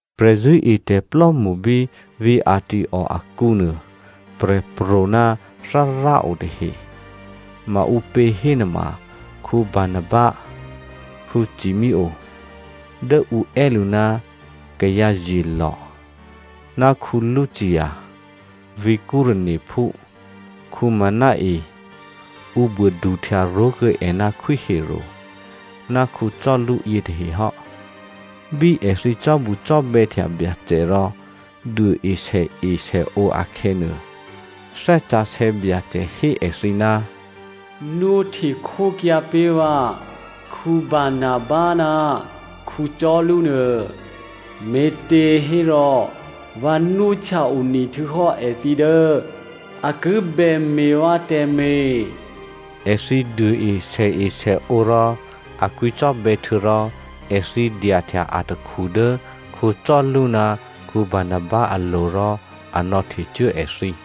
Prè̤zṳ̂́etè̤plò́mṳ bí vǐ̤ Antioko akǔnuô prè̤pro̤ ná Thárá o tahe. Maǔpě hénuôma Barnaba, Simeonè (Dố ǔ è́ lǔ ná kayǎzyelò̤) ná Lucio (Vǐ̤ Cyreneophú), Menaen (Ǔ buô duhtya ró̤kuô̌ è ná Khwí Herodè) ná Saulu yětahe hò́. Bí èthǐ cò́bucò́bè̌htya Byacè rò duôe sèesèǒ akhè̌nuô, Thè́ Sǎsè̌ Byacè hé èthǐ, “Nwóhte khókyǎ pé̤ vǎ Barnaba ná Saulu nuô. Me̤těhérò vǎ nwóhtya one htuô̌hò́ èthǐ dố a ki bè me̤ vǎ tè̤me̤.” Èthǐ duôe sèesèǒ rò a kwǐcò́bè̌, htuô̌rò èthǐ dyahtya atakhu dố Saulu ná Barnaba alo̤ rò a nò̌htecuố èthǐ.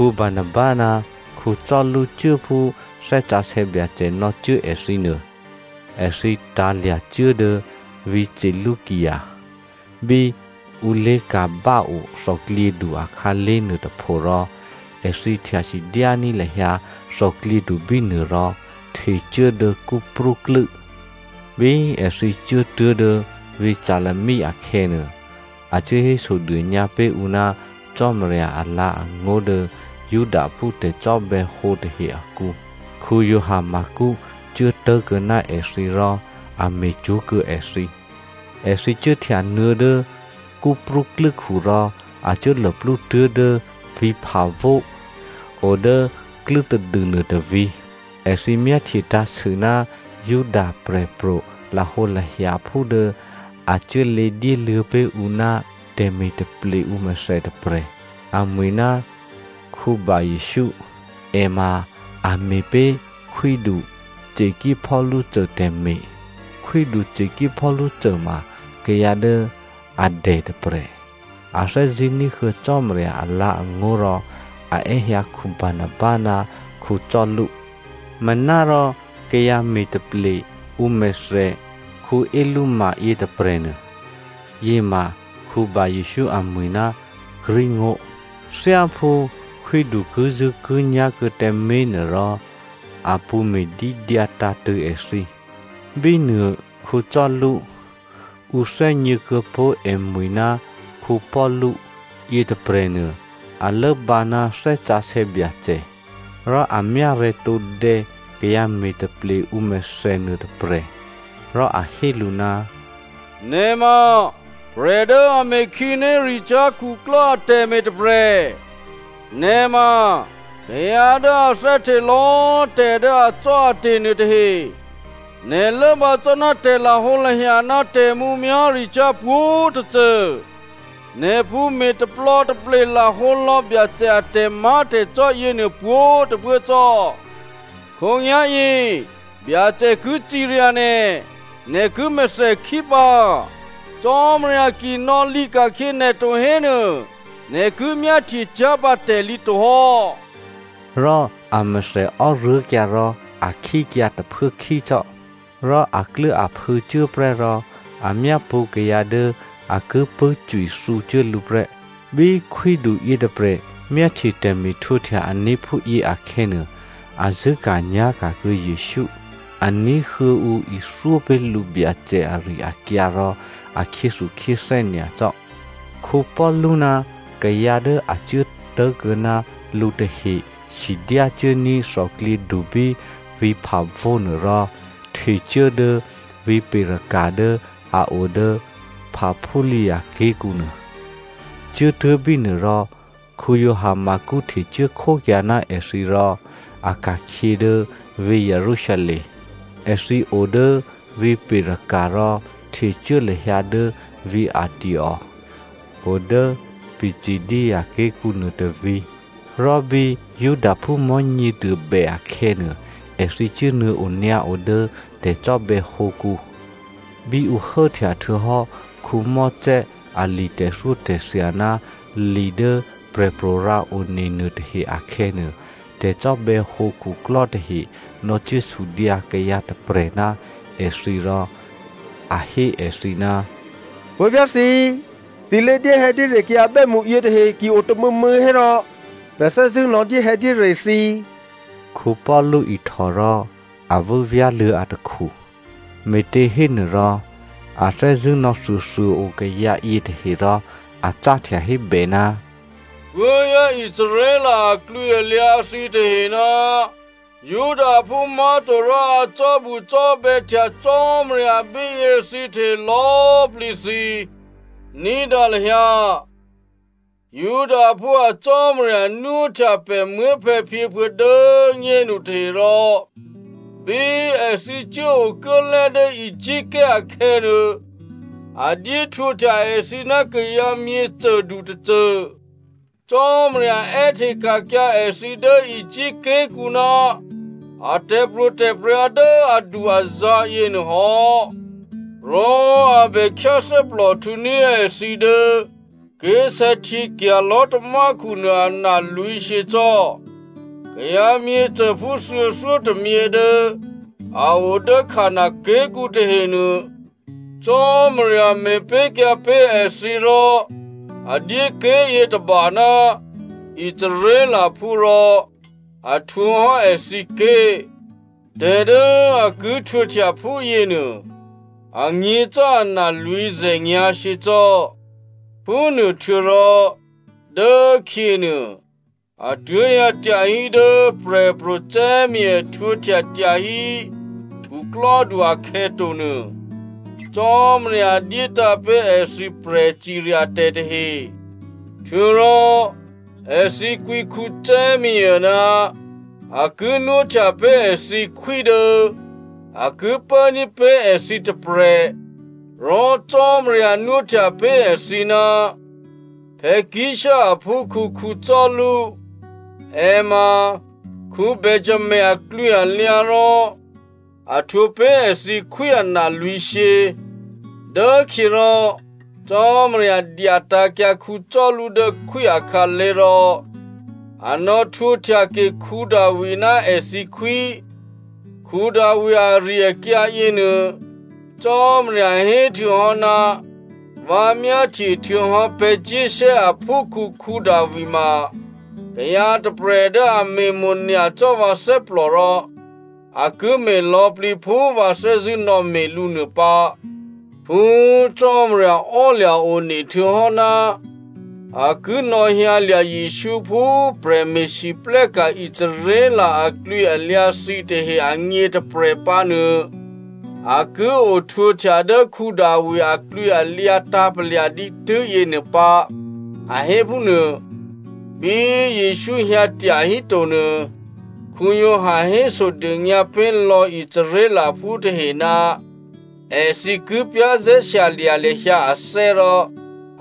Barnaba ná Saulu cuố phú Thè́ Sǎsè̌ Byacè nò̌cuố èthǐ nuô. Èthǐ tǎ̤lya̤cuố dố vǐ̤ Seleucia bí ǔ lé̤ka̤báo thòklyědu akhǎlé̤ nuôtôpho rò èthǐ htya sidyání̤ lahyǎ thòklyědu bínuô rò htecuố dố Cyprú klû́. Bí èthǐ cuốtuố̤ dố vǐ̤ Salami akhè̌nuô, a cuố hésodônyǎ pé̤ ǔ ná Cò́marya alǎ̤angó̤ dố Judaphú tè̤cò́bè̌hǒ tahe akǔ. Giovanni Marko cuố tố̤kuô̌ ná èthǐ rò a me̤cwó̤kuô̌ èthǐ. Èthǐ cuốhtyanuô̌ dố Cyprú klû́khu rò a cuố luplú tuố̤dố vǐ̤ Papho o dố klû́tadû nuôtôvǐ̤. Èthǐ myáhtye tǎ̤sû ná Juda prè̤pro̤ lahǒlahyaphú dố a cuốlě dyéluô̌ pé̤ ǔ ná tè̤me̤taple ǔmèthè tôprè̤. Amwi̤ ná Bar‑Jesǔ. È ma a me̤pé̤ khwídu Sergio tè̤me̤. Khwídu Sergio ma kayǎ dố a dè tôprè̤. A thè́zṳ̂́ ní̤huô̌ Cò́marya alǎ̤angó̤ rò a è́hyǎ Barnaba ná Saulu. Manárò kayǎ me̤taple ǔ mèthè Elyma yětôprè̤nuô, (Yěma Bar‑Jesǔ amwi̤ ná Greek ngó̤), thyáphú khwídu kizṳ̂́kinyá̤ kuô̌ tǎmé̤ nuôrò, a pṳ̌ me̤dídyǎ tǎ̤tṳ̂̌ èthǐ. Bínuô Saulu (Ǔ thè́gně kuô̌pó̤ èmwi̤ ná Paulu) yětôprè̤nuô, a lốbǎ ná Thè́ Sǎsè̌ Byacè. Rò a myárè̤̌ tǒdè̌ kayǎ me̤taple ǔmèthè nuôtôprè̤. Rò a hé lǔ, “Nè̤ ma prè̤ dố a me̤ khǐnéricyá̤ khuklò́ atè̤me̤ tôprè̤. Nè̤ ma kayǎ dố a thè́hte lò̌꤮ tè̤ dố acò́ate̤ nuôtahe. Nè̤ lốbǎ cò́ ná tè̤lahǒlahya ná tè̤mǔmyá̤ricyá̤ pwǒ̤tôcô, nè̤ pṳ̌ me̤taplò̌taple lahǒ lò̌ Byacè a tè̤má̤tè̤cò́ yěnuô pwǒ̤꤮ tôphuố cò́. Khǒnyá̤yě Byacè ki cirya nè̤, nè̤ ki mèthèkhí pǎ, Cò́marya ki nò̌lǐka̤khyě nè̤ to hénuô, nè̤ ki myáhtyecyá̤ pǎ tè̤lǐ tohò́.” Rò amèthè ò́ruố̤kyǎ rò a khíkyǎ tôphuốkhí cò́. Rò akluốaphû̌ cuốprè́ rò a myápṳ̌ kayǎ dố a ki pṳ̂́cwithǔcuố lǔ prè́. Bí khwídu yětôprè̤ myáhtye tè̤me̤htwǒhtya ané̤ phúyě akhè̌nuô, a zṳ̂́ka̤nyá̤ka̤ kuô̌ Jesǔ. A ní̤huô̌ ǔ ithyó pé̤ lǔ Byacè ari-akyǎ rò a khyéthukhyéthè́ nyacò́. Paulu ná kayǎ dố a cuố tố̤kuô̌ ná lǔ tahe sidyácuốní̤ thòklyědu bí vǐ̤ Papho nuôrò htecuố dố vǐ̤ Perga dố a o dố Pamphylia ké̤kǔnuô. Cuốtuố̤ bínuô rò Giovanni Marko htecuố khókyǎ ná èthǐ rò a ka̤khyě dố vǐ̤ Jerusalem. Èthǐ odố vǐ̤ Perga rò htecuố lahyǎ dố vǐ̤ Antioko o dố Pisidia ké̤kǔnuô tôvǐ̤. Rò bí Judaphú Mò̤́nyěduô bè akhè̌nuô, èthǐ cuốnuô̌ onyǎo dố tè̤cò́bè̌hǒkǔ. Bí ǔ hốhtyahtuô̌hò́ Mosè ali tè̤thyótè̤thya ná li dố prè̤pro̤ rǎone nuôtahe akhè̌nuô, tè̤cò́bè̌hǒ khuklò́ tahe nò̌cuốsudyǎ kayǎ tôprè̤ ná èthǐ rò a hé èthǐ, “Puố̤vyá̤ thǐ꤮, thǐ lé̤dyéhè̌dyére kayǎ bè́mṳ yětahe ki o tômû̌mû̌ hérò, pè̤ thè́zṳ̂́ nò̌dyéhè̌dyére thǐ.” Paulu ihtò rò a vû́vyá̤luô̌ atakhu. Me̤těhénuôrò a thè́zṳ̂́ nò̌thuôthuô꤮ o kayǎ yětahe rò a cáhtya hébè, “Puố̤vyá̤ Israel aklwǐalyǎ thǐtahe ná Judaphú má̤to rò a cò́bucò́bè̌htya Cò́marya bíyě thǐtahe lò̌꤮ plǐ thǐ꤮, ní̤dǎ lahyǎ. Judaphú a Cò́marya nwóhtya pè̤ muố̤phè̌phyěphuô̌ dố꤮ nyénu tahe rò bí èthǐ cuốokuốlè́ dố Egypt ké̤ akhè̌nuô, a dyé htwǒhtya èthǐ ná kayǎ myěcôdu tôcô. Cò́marya è́hteka̤kyǎ èthǐ dố Egypt ké̤kǔ ná a tè̤pro̤tè̤prya̤ dố adu-azǎ̤ yěnuô hò́. Rò a bè khyáthè́plòhtǔní̤ èthǐ dố ké̤sè̌htyěkya̤ lò̤́tamákhu nuô analwǐ̤shyě cò́. Kayǎ myěcôphú thuô̌thyótômyě dố a o dố Canan ké̤kǔ tahenuô Cò́marya me̤pé̤kyǎ pé̤ èthǐ, rò a dyé ké̤yětôba ná Israelphú rò a htwǒ hò́ èthǐké̤. Tè̤ dố a ki htwǒhtya phúyěnuô, anyě̤ cò́ ana lwǐ̤zè̤nyǎ̤shyě cò́. “Phúnuô htuô̌rò dốkhyěnuô, a tuố̤hyǎ tyahí dố Prè̤pro̤ Samuelè htwǒhtya tyahí khuklò́du akhè̌ tonuô, Cò́marya dyétǎ̤ pé̤ èthǐ prè̤ciryatè̤ tahe. Htuô̌rò èthǐ kwǐ Samuelè ná a ki nwóhtya pé̤ èthǐ khwí dố a ki pốní̤ pé̤ èthǐ tôprè̤. Rò Cò́marya nwóhtya pé̤ èthǐ ná Kish aphúkhǔ Saulu. È ma Benjamino aklwǐalyǎ rò a htwǒ pé̤ èthǐ khwí analwǐ̤shyě. Dốkhyěrò Cò́marya dyatǎ̤kyǎ Saulu dố khwí akhǎlé̤ rò a nò̌htwǒhtyake Davi ná èthǐ khwí. Davi ari-akyǎ yěnuô Cò́marya héhtuô̌hò́, ‘Vǎ myáhtyehtuô̌hò́ Jesse aphúkhǔ Davi ma kayǎ tôprè̤ dố a me̤mo̤nyacò́ vǎ thè́plò rò a ki me̤ lò̌plǐ phú vǎ thè́zṳ̂́ nò̌me̤ lǔ nuô pǎ.’ “Phú Cò́marya ò́lya̤ one htuô̌hò́ ná a ki nò̌hyǎlya̤ Jesǔ phú prè̤me̤lwóhteka̤ Israel aklwǐalyǎ thǐtahe agně tôprè̤ pǎ nuô, a ki ohtwǒhtya dố Davi aklwǐalyǎ tǎ̤palya̤ dǐtû́ yěnuô pǎ a hé phúnuô. Bí Jesǔ hyǎ tyahíto nuô, Giovanni hésodônyǎ pé̤lò̌ Israelphú tahe ná èthǐ ki za̤ ní̤dû lahyǎ ané̤ rò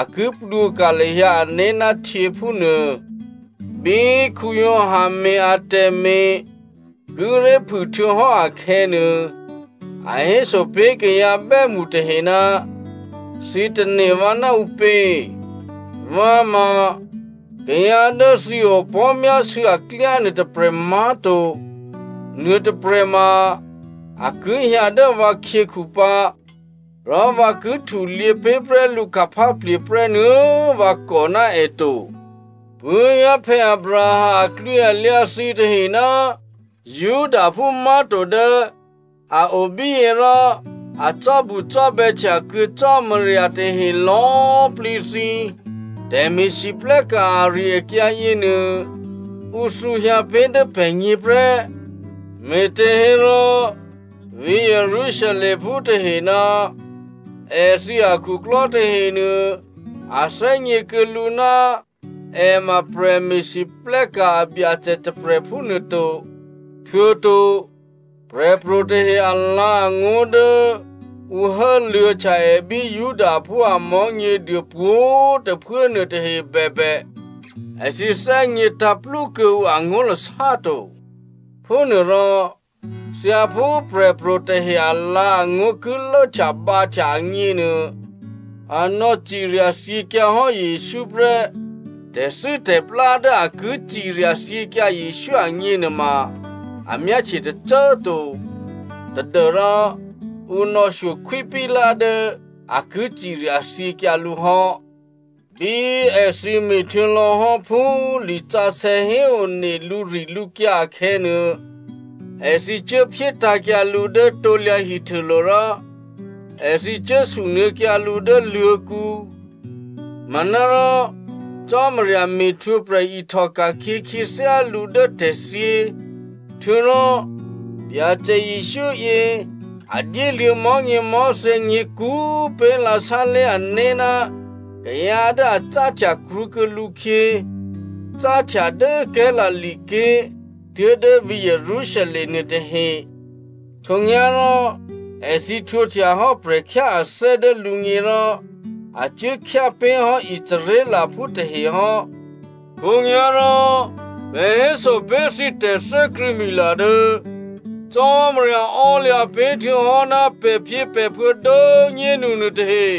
a ki plwǒka̤ lahyǎ ané̤ ná htyě, phúnuô. Bí Giovanni me̤ atè̤me̤ kíré̤ phû htuô̌hò́ akhè̌nuô, a héso pé̤ kayǎ bè́mṳ tahe, ‘Thǐ tane̤ vǎ ná ǔpě? Vǎ ma kayǎ dố thǐ opò̤́myásû̌ aklyá nuôtôprè̤ má̤to. Nuôtôprè̤ ma a ki hyǎ dố vǎkhyěkhu pǎ, rò vǎ ki htulyě pé̤prè́ lǔ khupháplye̤ prè́ nuô̌꤮ vǎ kò ná è to.’ “Puố̤vyá̤ Abraham aklwǐalyǎ thǐtahe ná Judaphú má̤to dố a o bíyě rò a cò́bucò́bè̌htya kuô̌ Cò́marya tahe lò̌꤮ plǐ thǐ꤮, tè̤me̤lwóhteka̤ ari-akyǎ yěnuô, ǔ thǔhyǎ pé̤ dố pè̤gně prè́. Me̤těhérò vǐ̤ Jerusalemphú tahe ná èthǐ akhuklò́ tahenuô a thè́gně kuô̌ lǔ ná è ma prè̤me̤lwóhteka̤ a Byacè tôprè̤ phúnuôto. Htuô̌to prè̤pro̤tahe alǎ̤angó̤ dố ǔ hốluô̌htya è bí Judaphú a Mò̤́nyěduô pwǒ̤꤮ tôphuố nuôtahe bèbè, èthǐ thè́gně tǎ̤plú kuô̌ǔ angó̤lasá to. Phúnuôrò thyáphú prè̤pro̤ tahe alǎ̤angó̤ ki lốhtyabǎhtya agněnuô, a nò̌cirya thyěkyǎ hò́ Jesǔ prè́. Tè̤thû́tè̤plá dố a ki cirya thyěkyǎ Jesǔ agněnuôma a myáhtye tôcô꤮ to tadû́rò ǔ nò̌shyo Khwí Pilato dố a ki ciryathyěkyǎ lǔ hò́. Bí èthǐ me̤htuô̌ lò̌hò́ phú lisǎsè̌ héone lǔrilǔkyǎ akhè̌nuô, èthǐ cuốphyétǎ̤kyǎ lǔ dố krusulo̤ rò èthǐ cuốsunuô̌kyǎ lǔ dố luô̤̌kǔ. Manárò Cò́marya me̤htwǒprè̤ ihtòka̤khyě khyěthyá lǔ dố tè̤thyě. Htuô̌rò Byacè Jesǔ yě a dyéluô̌ mò̤́nyěmò̤́thè̌ nyě̤kú꤮ pé̤lǎ sálé̤ ané̤ ná kayǎ dố a cáhtya krwǒkuô̌ lǔkhyě, cáhtya dố Galilea ké̤ tuố̤dố vǐ̤ Jerusalem nuôtahe. Khǒnyá̤rò, èthǐ htwǒhtyahò́ prè̤khyáathè́ dố lǔgně rò a cuố khyápé̤hò́ Israelphú tahe hò́. “Khǒnyá̤rò pè̤ héso pé̤ thǐ tè̤thè́krṳ̂̌mila: Tè̤ dố Cò́marya ò́lya̤ pé̤ htuô̌hò́ ná pè̤phyěpè̤phuô̌ dố꤮ nyénu nuôtahe,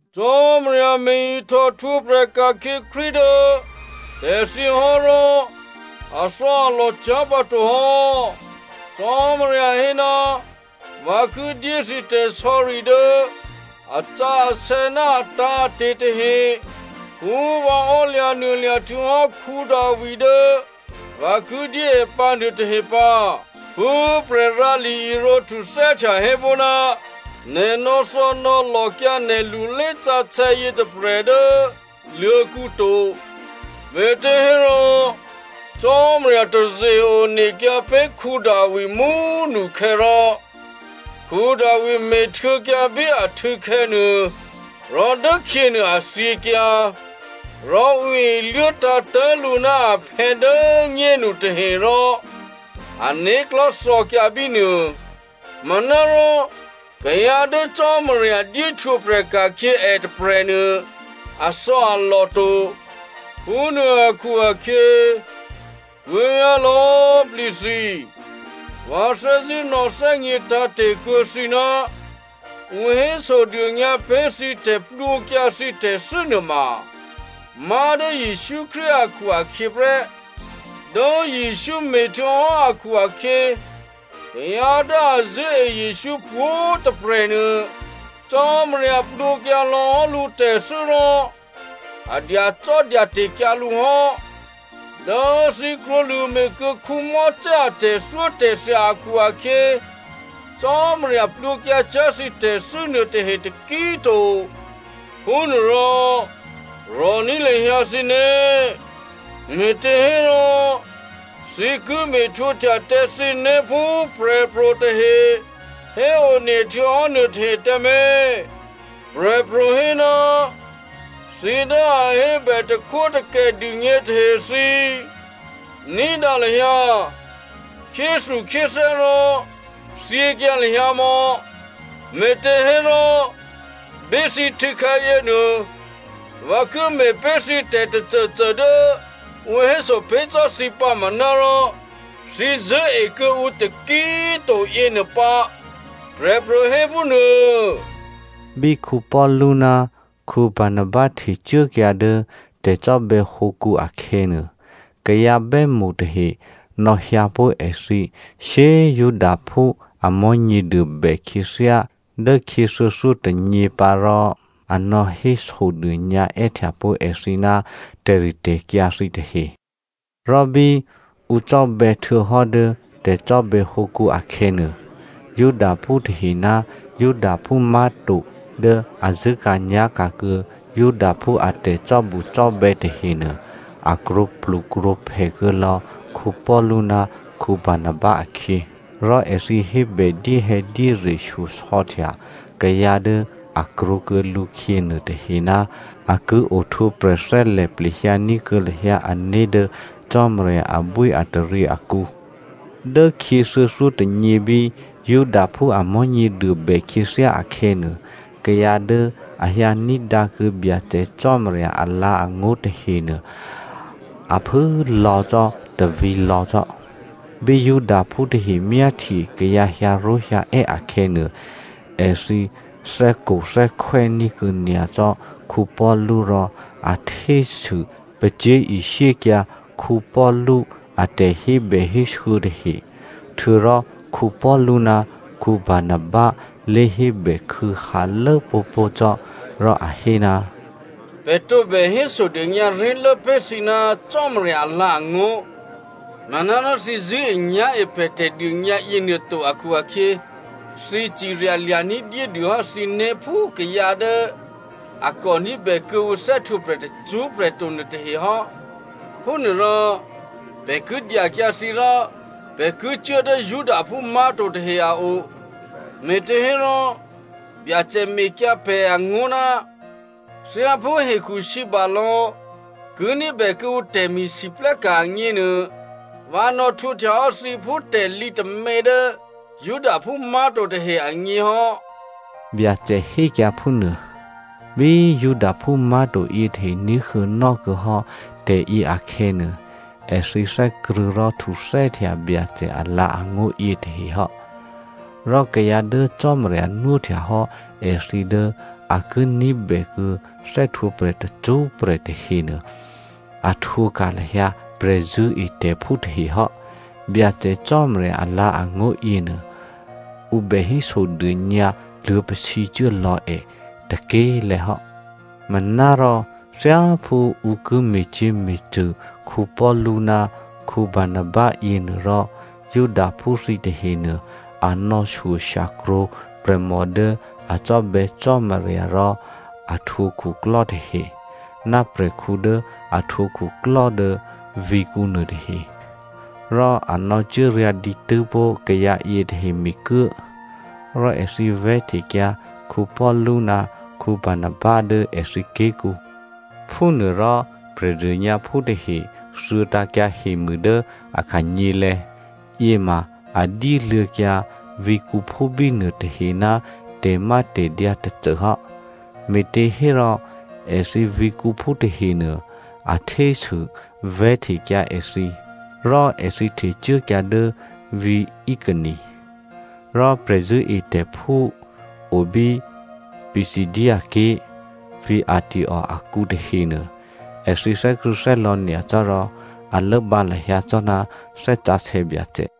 “Cò́marya me̤-ihtò htwǒprè̤ ka̤khyě Krístu dố tè̤thyě hò́ rò athò̌alò cyá̤ pǎto hò́. Cò́marya hé, ‘Vǎ ki dyé thǐ tè̤sò̌ri dố asǎsè̌ ná atǎ̤ate̤ tahe phú vǎ ò́lya̤nuôlya̤ htuô̌hò́ Davi dố vǎ ki dyé è pǎ nuôtahe pǎ.’ “Phú prè̤rǎli irǒ htuthè́htya hé pó̤, ‘Nè̤ nò̌thò̌nò̌lòkyǎ nè̤ lulésǎsè̌ yětôprè̤ dố luô̤̌kǔ to.’ “Me̤těhérò Cò́marya taze-onekyǎ pé̤ Davi mú꤮ nukhè̌ rò Davi me̤htuô̌kyǎ bí ahtû̌khè̌ nuô, rò dốkhyěnuô a thyěkyǎ. Rò ǔ iluốtǎ̤tố̤ lǔ ná aphè̌ dố꤮ nyénu tahe rò ané̤klò̤́ thò̌kyǎ bínuô. Manárò kayǎ dố Cò́marya dyé htwǒprè̤ ka̤khyě è tôprè̤nuô athò̌alò to. “Phúnuô akhu-akhyě, puố̤vyá̤ lò̌꤮ plǐ thǐ꤮ vǎ thè́zṳ̂́ nò̌thè́gně tǎ̤te̤ kuô̌ thǐ ná ǔ hésodônyǎ pé̤ thǐ tè̤plwǒkyǎ thǐ tè̤thû́ nuôma má̤dố Jesǔ Krístu akhu-akhyě prè́. Dố Jesǔ me̤htuô̌hò́ akhu-akhyě, kayǎ dố a zṳ̂́e Jesǔ pwǒ̤꤮ tôprè̤ nuô Cò́marya plwǒkyǎ lò̌hò́ lǔtè̤thû́ rò a dyacò́dyate̤kyǎ lǔ hò́. Dố thǐ krwǒlṳ̂ me̤kuô̌ Mosè a tè̤thyótè̤thya akhu-akhyě, Cò́marya plwǒkyǎcyá̤ thǐ tè̤thû́ nuôtahe taki꤮ to. Phúnuôrò rò̤ní̤ lahyǎ thǐné̤, me̤těhérò thǐ ki me̤htwǒhtya tǎ thǐné̤ phú prè̤pro̤ tahe héone htuô̌hò́ nuôtahe tǎmé̤. Prè̤pro̤ hé, ‘Thǐ dố a hébè takhwótakè dûgně tahe thǐ꤮, ní̤dǎ lahyǎ! Khyéthukhyéthè́ rò thyěkyǎ lahyǎ mò̌. Me̤těhérò, bí thǐ htû̌khè̌ yěnuô vǎ ki me̤pé̤ thǐ tè̤tôcôcô dố ǔ héso pé̤ cò́ thǐ pǎ manárò thǐ zṳ̂́e kuô̌ǔ taki꤮ to yěnuô pǎ,’ prè̤pro̤ hé phúnuô.” Bí Paulu ná Barnaba htecuốkyǎ dố tè̤cò́bè̌hǒkǔ akhè̌nuô, kayǎ bè́mṳ tahe nò̌hyǎpó̤ èthǐ shyé꤮ Judaphú a Mò̤́nyěduô bè khyěthyá dốkhyě thuô̌thyótônyě pǎ rò a nò̌hésodônyǎ è́htya pó̤ èthǐ ná tè̤ritè̤kyǎ thǐtahe. Rò bí ǔ cò́bè̌ htuô̌hò́ dố tè̤cò́bè̌hǒkǔ akhè̌nuô, Judaphú tahe ná Judaphú má̤to dố a zṳ̂́ka̤nyá̤ka̤ kuô̌ Judaphú a tè̤cò́bucò́bè̌ tahenuô, a krwǒplukrwǒphè kuô̌lò̌ Paulu ná Barnaba akhyě. Rò èthǐ hébè dyéhè̌dyére shyosò̌htya kayǎ dố a krwǒkuô̌ lǔkhyě nuôtahe ná a ki ohtwǒprè̤ thè́lè̤ plehyǎ ní̤kuô̌ lahyǎ ané̤ dố Cò́marya abwíataryě akǔ. Dốkhyě thuô̌thyótônyě bí Judaphú a Mò̤́nyěduô bè khyěthyá akhè̌nuô, kayǎ dố a hyǎ ní̤dǎkuô̌ Byacè Cò́marya alǎ̤angó̤ tahenuô a phû꤮ lò̌ cò́ tôvǐ̤lò̌ cò́. Bí Judaphú tahe myáhtye kayǎ hyǎró̤hyǎè́ akhè̌nuô, èthǐ thè́kothè́khwè́ ní̤kuô̌ nyacò́ Paulu rò a htésû pacyé̤ishyékyǎ Paulu a tè̤hébèhésû̌ tahe. Htuô̌rò Paulu ná Barnaba lé hébè khû̌hǎlố pó̤pó̤ cò́, rò a hé, “Pè̤ tǒbè hésodônyǎ ré̤lố pé̤ thǐ ná Cò́marya alǎ̤angó̤. Manárò thǐ zṳ̂́enyá̤e pè̤ tè̤dônyǎ yěnuô to akhu-akhyě, thǐ ciryalya̤ ní̤dyédû hò́ thǐné̤ phú kayǎ dố a kò ní̤bè kuô̌ǔ thè́htwǒprè̤ tacṳ́prè̤ to nuôtahe hò́. Phúnuôrò pè̤ ki dyakyǎ thǐ rò pè̤ ki cuố dố Judaphú má̤to tahe a o. Me̤těhérò, Byacè mekyǎ pè̤ angó̤, ‘Thyáphú hekhusǐbalò̌ ki ní̤bè kuô̌ǔ tè̤me̤lwóhteka̤ agněnuô, vǎ nò̌htwǒhtyahò́ thǐ phú tè̤lǐ tômě dố Judaphú má̤to tahe agně hò́.’” Byacè hékyǎ phúnuô. Bí Judaphú má̤to yětahe ní̤huô̌nò́ kuô̌ hò́ tè̤yě akhè̌nuô, èthǐ thè́krṳ̂̌ rò htuthè́htya Byacè alǎ̤angó̤ yětahe hò́. Rò kayǎ dố Cò́marya nwóhtya hò́ èthǐ dố a ki ní̤bèkuô̌ thè́htwǒprè̤ tacṳ́prè̤ tahenuô, a htwǒka̤ lahyǎ prè̤zṳ̂́etè̤phú tahe hò́. Byacè Cò́marya alǎ̤angó̤ yěnuô, ǔ bè hésodônyǎ luô̌pasǐcuố lò̌ è tôké̤lè̤̌ hò́. Manárò thyáphú ǔ ki me̤cyě̤me̤cṳ̂ Paulu ná Barnaba yěnuôrò Judaphú thǐ tahenuô, a nò̌shyo shyakrwǒ prè̤mò dố a cò́bè̌ Cò́marya rò a htwǒ khuklò́ tahe, ná prè̤khǔ dố a htwǒ khuklò́ dố vǐ̤kǔ nuôtahe, rò a nò̌cuốryǎ̤ dǐtû́ pó̤ kayǎ yětahe mikuố. Rò èthǐ vè̤́htekyǎ Paulu ná Barnaba dố èthǐ ké̤kǔ. Phúnuôrò Prè̤dônyǎphú tahe thuô̌tǎ̤kyǎ hemû dố a khanyělè̤̌. Yěma a dyéluô̌kyǎ vǐ̤kǔphú bínuô tahe ná tè̤mátè̤dyǎ tôcô hò́, me̤těhérò èthǐ vǐ̤kǔphú tahenuô, a htésû vè̤́htekyǎ èthǐ, rò èthǐ htecuốkyǎ dố vǐ̤ Iconio. Rò prè̤zṳ̂́etè̤phú o bí Pisidia ké̤, vǐ̤ Antioko akǔ tahenuô, èthǐ thè́krṳ̂̌thè́lò̌ nyacò́ rò a lốbǎ lahyǎ cò́ ná Thè́ Sǎsè̌ Byacè.